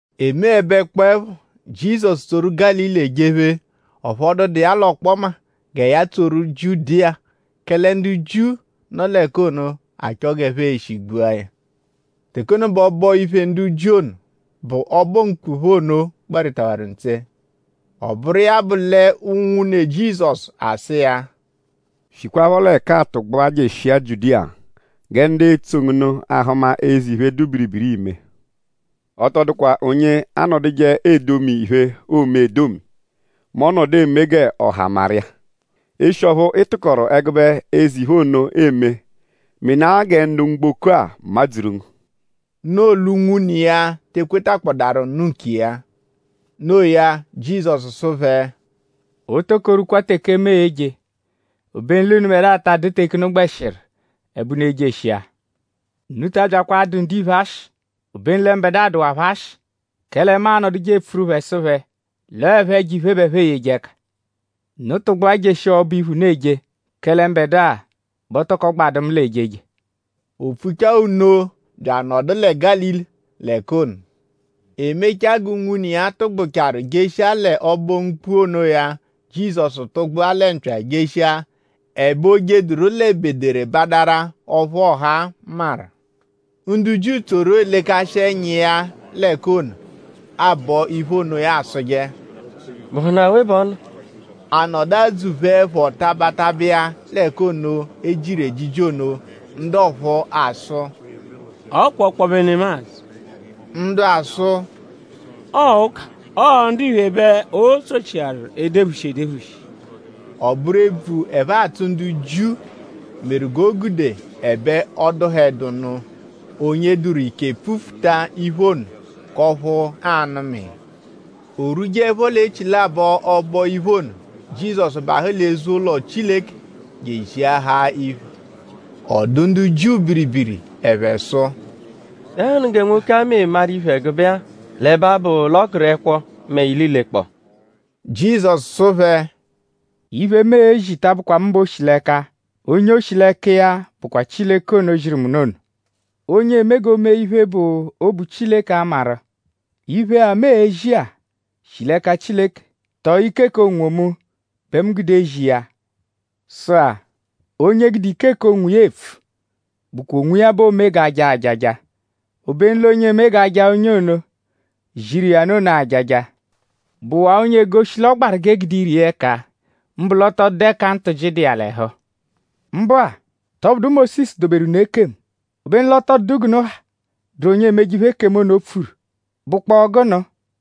E meẹbekpoepho; Jizọsu tsoru Gálili ejephe; ọphu ọ dụdu iya l'ọkpoma gẹ ya tsoru Jiudiya; kẹle ndu Jiu, nọ l'ẹka ono achọ g'ẹphe e-shi gbua ya. Teke ono bẹ ọbo-iphe ndu Jiu ono, bụ Ọbo-M̀kpù phẹ ono gbarịtawaru ntse. Ọ bụru iya bụ l'unwune Jizọsu asụ iya: “Shikwaphọ l'ẹka-a tụgbua jeshia Jiudiya gẹ ndu etsoje ngu nụ ahụma eze iphe, dụ biribiri, iime. Ọ tọ dụkwa onye anọduje edomi iphe, oome edomi mẹ ọ -nọdu eme g'ọha maru iya. Eshi ọphu ị tụkoru ẹgube eze iphe ono eme; menaa gẹ ndu mgboko-a madzuru ngu.” Noo l'unwune iya te ekwetakpọdarunu nkiya. Noo ya; Jizọsu sụ phẹ: “O toko rwukwa teke mu e-je; obenu l'unubẹdua ta adụdu teke unu gbẹshiru ẹbe unu ejeshia. Unu ta abyakwa adụ ndiphe ashị: obenu lẹ mbẹdua bẹ dụwaa phẹ ashị; kẹle mu anọduje epfuru phẹ sụ phẹ l'ọo ẹpho ẹjo-iphe bẹ ẹphe eyeje ẹka. Unu tụgbua jeshia ọbo-iphe, unu eje; kẹle mbẹdua bẹ o toko gbadụ mu l'ejeje.” O pfuchaa nno bya anọdu lẹ Gálili l'ẹka ono. E mechaa g'unwune iya tụgbucharu jeshia lẹ Ọbo-M̀kpù onoya; Jizọsu tụgbua lẹ mpya jeshia; ẹbe o jeduru l'ebederebadara ọphu ọha maru. Ndu Jiu tsoru elekashi ẹnya iya l'ẹka ono, aabọ iphe ono asụje: “?Bụhunu awe bẹ ọ nọ?” A nọdu adzụ-pheẹpho taba taba iya l'ẹka ono, e jiru ejiji ono. Ndu ọphu asụ: “Ọ kwa ọkpobe nemadzụ.” Ndu asụ: “Ọo ụka. Ọo ndiphe bẹ o tsochiaru edephushi edephushi.” Ọ bụru ebvu, ẹphe atsụ ndu Jiu meru g'o gude ẹbe ọ dụhedunu onye dụru ike pfufuta iphe ono k'ọphu aa-nụma iya. O rwujeẹpho l'echilabọ ọbo-iphe ono; Jizọsu bahụ l'eze-ụlo Chileke je eziahaa iphe. Ọ dụ ndu Jiu biribiri. Ẹphe sụ: “?Dẹnuhunu gẹ nwoke-a meru maru iphe ẹgube-a l'ẹbe abụ l'ọ gụru ẹkwo mẹ ililekpọo?” Jizọsu sụ phẹ: “Iphe, mu ezi ta abụkwa mu bẹ o shi l'ẹka. Onye o shi l'ẹka iya bụkwa Chileke ono, ziru mu nụ ono. Onye eme g'o mee iphe, bụ obu Chileke a-maru:?iphe-a, mu ezi-a shi l'ẹka Chileke tọo ike k'onwomu bẹ mu gude ezi iya. Sụ-a; onye gude ike k'onwiya epfu bụkwa onwiya bẹ oome g'a jaa ajaja; obenu l'onye eme g'onye ono, ziru iya nụ ono jaa ya ajaja bụwaa onye egoshi l'ọ gbaru g'eegude ire iya ẹka; mbụ ọ tọ dụdu ẹka ntụji dụ iya l'ẹhu. Mbụ-a;?tọ bụdu Mósisu doberu unu ekemu? Obenu l'ọ tọ dụdu g'unu ha, dụru onye emeje iphe, ekemu ono pfuru.?Bụkpoo gụnu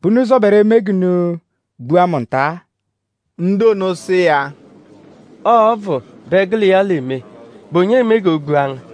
bẹ unu zọberu eme g'unu gbua mu nta-a?” Ndu ono sụ iya: “Ọo ọbvu bẹ gụ l'iya eme.?Bụ onye eme g'o gbua ngu?”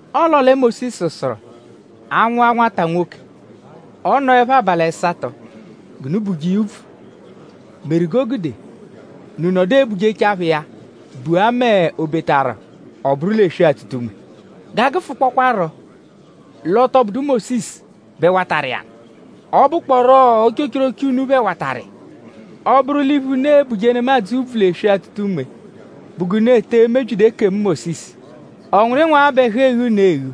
Ọo l'ọo lẹ Mósisu sụru; a -nwụa nwata nwoke; ọ -nọepho abalị ẹsato g'unu buje iya úbvù meru g'o gude unu nọdu ebujechaa phẹ iya bua mẹ o -betaru ọ bụru l'eswe-atụta-unme. G'a gụfukpokwaaro l'ọ tọ bụdu Mósisu bẹ watarụ iya nụ; ọ bụkporo ochochoroche unu phẹ watarụ iya. Ọ -bụru l'iphe, unu e-buje nemadzụ úbvù l'eswe-atụta-unme bụ g'unu ete emebyidu ekemu Mósisu?ọ nwụru ịnwu-agha bẹ ẹhu eghu unu eghu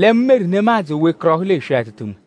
lẹ mu meru nemadzụ o wekọrohu l'eswe-atụta-unme?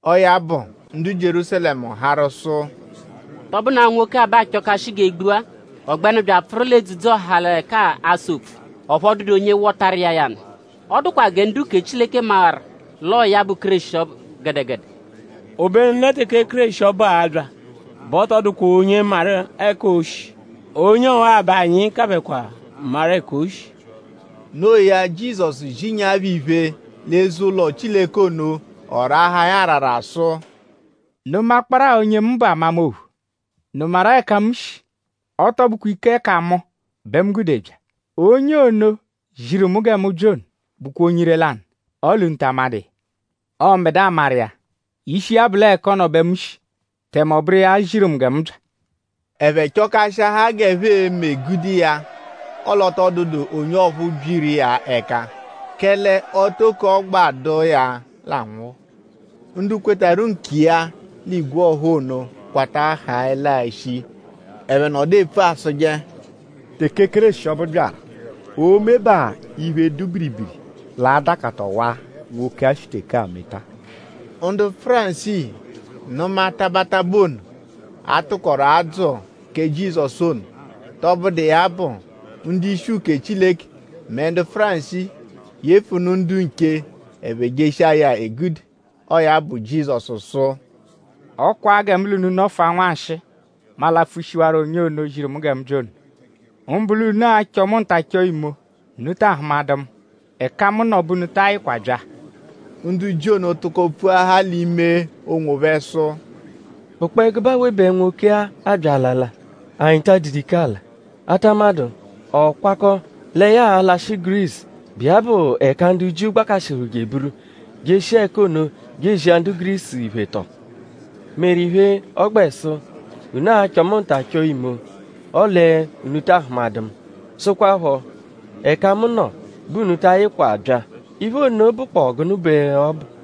Ọo ya bụ; ndu Jierúsalẹmu harụ sụ: “?Tọ bụnu-a nwoke-a bẹ aachọkashi g'e gbua? Ọ gbẹnu bya apfụru l'edzudzu-ọha l'ẹka-a asa opfu; ọphu ọ dụdu onye wọtaru iya ya nụ.?Ọ dụkwa gẹ ndu-uke Chileke mawaru l'ọo ya bụ Kéreshi ọbu gẹdegede? Obenu lẹ teke Kéreshi ọbu a-bya bẹ ọ tọ dụkwa onye amaru ẹka o shi. Onye ọwa bẹ anyi kabẹkwa maru ẹka o shi.” Noo ya; Jizọsu zinyaa phẹ iphe l'eze-ụlo Chileke ono; ọ raahaa ya arara sụ: “?Unu makpọru-a onye mu bụ amama ophu??Unu maru-a ẹka mu shi? Ọ tọ bụkwa ike k'ẹka mu bẹ mu gude bya. Onye ono, ziru mu gẹ mu bya ono bụkwa onye ire-lanụ; ọle unu ta amadụ iya. Ọo mbẹdua maru iya. Ishi iya bụ l'ọo ẹka ọ nọ bẹ mu shi; tẹme ọ bụru iya ziru mu gẹ mu bya.” Ẹphe chọkashiahaa g'ẹphe e-me gude iya; ọle ọ tọ dụdu onye ọphu byiru iya ẹka; kẹle o toko ọ gbadụ iya l'anwụhu. Ndu kwetarụ nkiya l'igwe ọha ono kwata haẹlaa shii. Ẹphe nọdu epfu asụje: “Teke Kéreshi ọbu byaru;?oo-mebaa iphe, dụ biribiri, l'a-dakata ọwa-a, nwoke-a shi teke-a meta-a?” Ndu Fárisii nụmanu taba taba ono, a tụkoru aadzụ kẹ Jizọsu ono. Tọbudu iya bụ; ndu-ishi uke Chileke mẹ ndu Fárisii yefunụ ndu nche; ẹphe jeshia ya egude. Ọo ya bụ; Jizọsu sụ: “Ọ kwaa gẹ mu l'unu nọfua nwanshịi; mu alapfushiwarọ onye ono, ziru mu gẹ mu bya ono. Mbụ l'unu a-chọ mu nta chọo imo; unu taa hụmadu mu; ẹka mu nọ bẹ unu ta ayịkwa bya.” Ndu Jiu ono tụko pfuahaa l'ime onwophẹ sụ: “?Bụkpoo ẹgube awe bẹ nwoke-a abya alala, anyi taa dụdu ike ala? A ta amadụ?ọ kwakọ lẹ ya a-lashị Gurisu, bụ iya bụ ẹka ndu Jiu gbakashịhuru je eburu; jeshia ẹka ono je ezi ndu Gurisu iphe tọo? Meru iphe, ọ gbẹ sụ: ‘Unu a-chọ mu nta chọo imo; ọle unu taa hụmadu mu.’ Sụkwapho: ‘Ẹka mu nọ bẹ unu ta ayịkwa bya.’?Iphe ono bụkpoo gụnu bẹ ọ bụ?”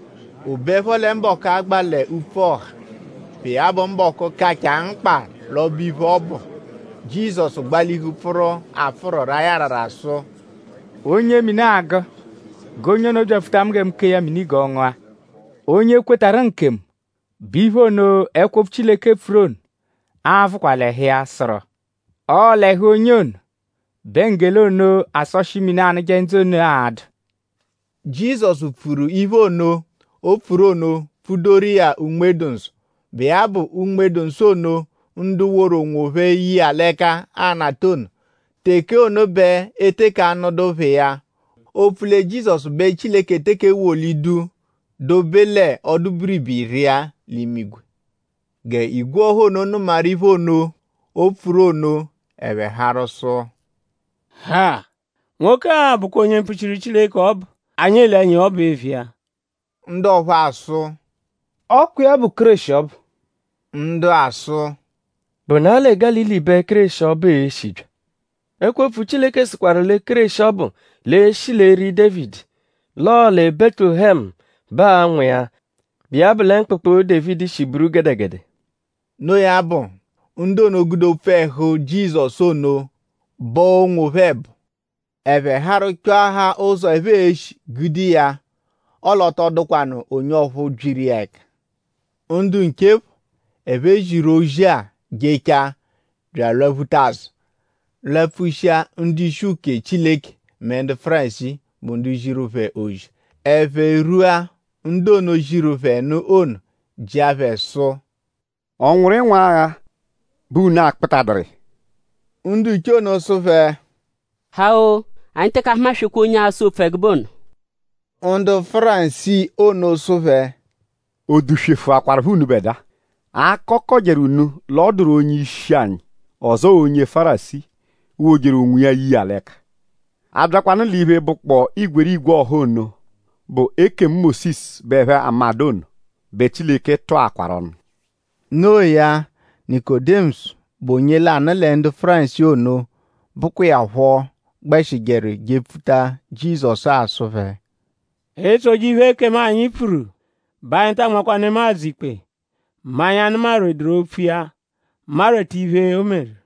O beẹpho lẹ mbọku agba l'upfu ọha, bụ iya bụ mbọku, kachaa mkpa l'ọbo-iphe ọbu; Jizọsu gbalihu pfụru apfụru raa ya arara sụ: “Onye mini agụ g'onye ono byapfuta mu gẹ mu kee ya mini g'ọ ngụa. Onye kwetarụ nkemu bẹ iphe ono, ẹkwo-opfu Chileke pfuru ono a-vụkwa l'ẹhu iya, sụru: ‘Ọo l'ẹhu onye ono bẹ nggele ono, asọshi mini, anụje ndzụ ono a-dụ.’” Jizọsu pfuru iphe ono, o pfuru ono pfudoru iya Unme-dụ-Nsọ, bụ iya bụ Unme-dụ-Nsọ ono, ndu woru onwophẹ ye iya l'ẹka a-nata ono. Teke ono bẹ e teke anụdu phẹ iya; opfu lẹ Jizọsu bẹ Chileke teke ewolidu dobe l'ọdu-biribiri iya l'imigwe. G'igwe ọha ono nụmaru iphe ono, o pfuru ono ẹphe harụ sụ: “Ha! Nwoke-a bụkwa onye mpfuchiru Chileke ọbu, anyi ele ẹnya iya ọbu eviya.” Ndu ọphu asụ: “Ọ kwa iya bụ Kéreshi ọbu.” Ndu asụ: “?Bụna-a lẹ Gálili bẹ Kéreshi ọbu e-shi bya? Ẹkwo-opfu Chileke sụkwaru lẹ Kéreshi ọbu l'e-shi l'eri Dévidi. L'ọo lẹ Bẹtulehemu bẹ aa-nwụ iya, bụ iya bụ lẹ mkpụkpu, Dévidi shi buru gẹdegede.” No iya bụ; ndu ono gude opfu ẹhu Jizọsu ono bọo onwophẹ ẹbo. Ẹphe harụ chọahaa ụzo, ẹphe e-shi gude iya; ọle ọ tọ dụkwanu onye ọphu byiru iya ẹka. Ndu nche phọ, ẹphe ziru ozi-a jechaa bya alwaphuta azụ lapfushia ndu-ishi uke Chileke mẹ ndu Fárisii, bụ ndu ziru phẹ ozi. Ẹphe rwua; ndu ono, ziru phẹ nụ ono jịa phẹ sụ: “?Ọ nwụru ịnwuagha bẹ unu akpụtaduru iya?” Ndu nche ono sụ phẹ: “Ha-o! Anyi teke ahumaswekwaa onye asa opfu ẹgube ono.” Ndu Fárisii ono sụ phẹ: “?O duswefụakwarupho unubẹdua? ?Akọ kọjeru unu l'ọ dụru onye-ishi anyi; ọzoo onye Fárisii, wojeru onwiya ye iya l'ẹka? Abyakwanụ l'iphe, bụkpoo igwerigwe ọha ono, bụ ekemu Mósisu bẹ ẹphe amadụ ono bẹ Chileke tụakwaru ọnu.” No iya; Nikodimọsu, bụ onye lanụ lẹ ndu Fárisii ono, bụkwa iya phọ gbẹshijeru jepfuta Jizọsu-a sụ phẹ: “E -tsoje iphe, ekemu anyi pfuru bẹ anyi taa nmakwa nemadzụ ikpe mẹ anyi -anụmaduru opfu iya; marweta iphe, o meru.”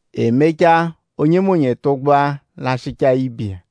E mechaa onyenọnu tụgbua lashịchaa ibe iya.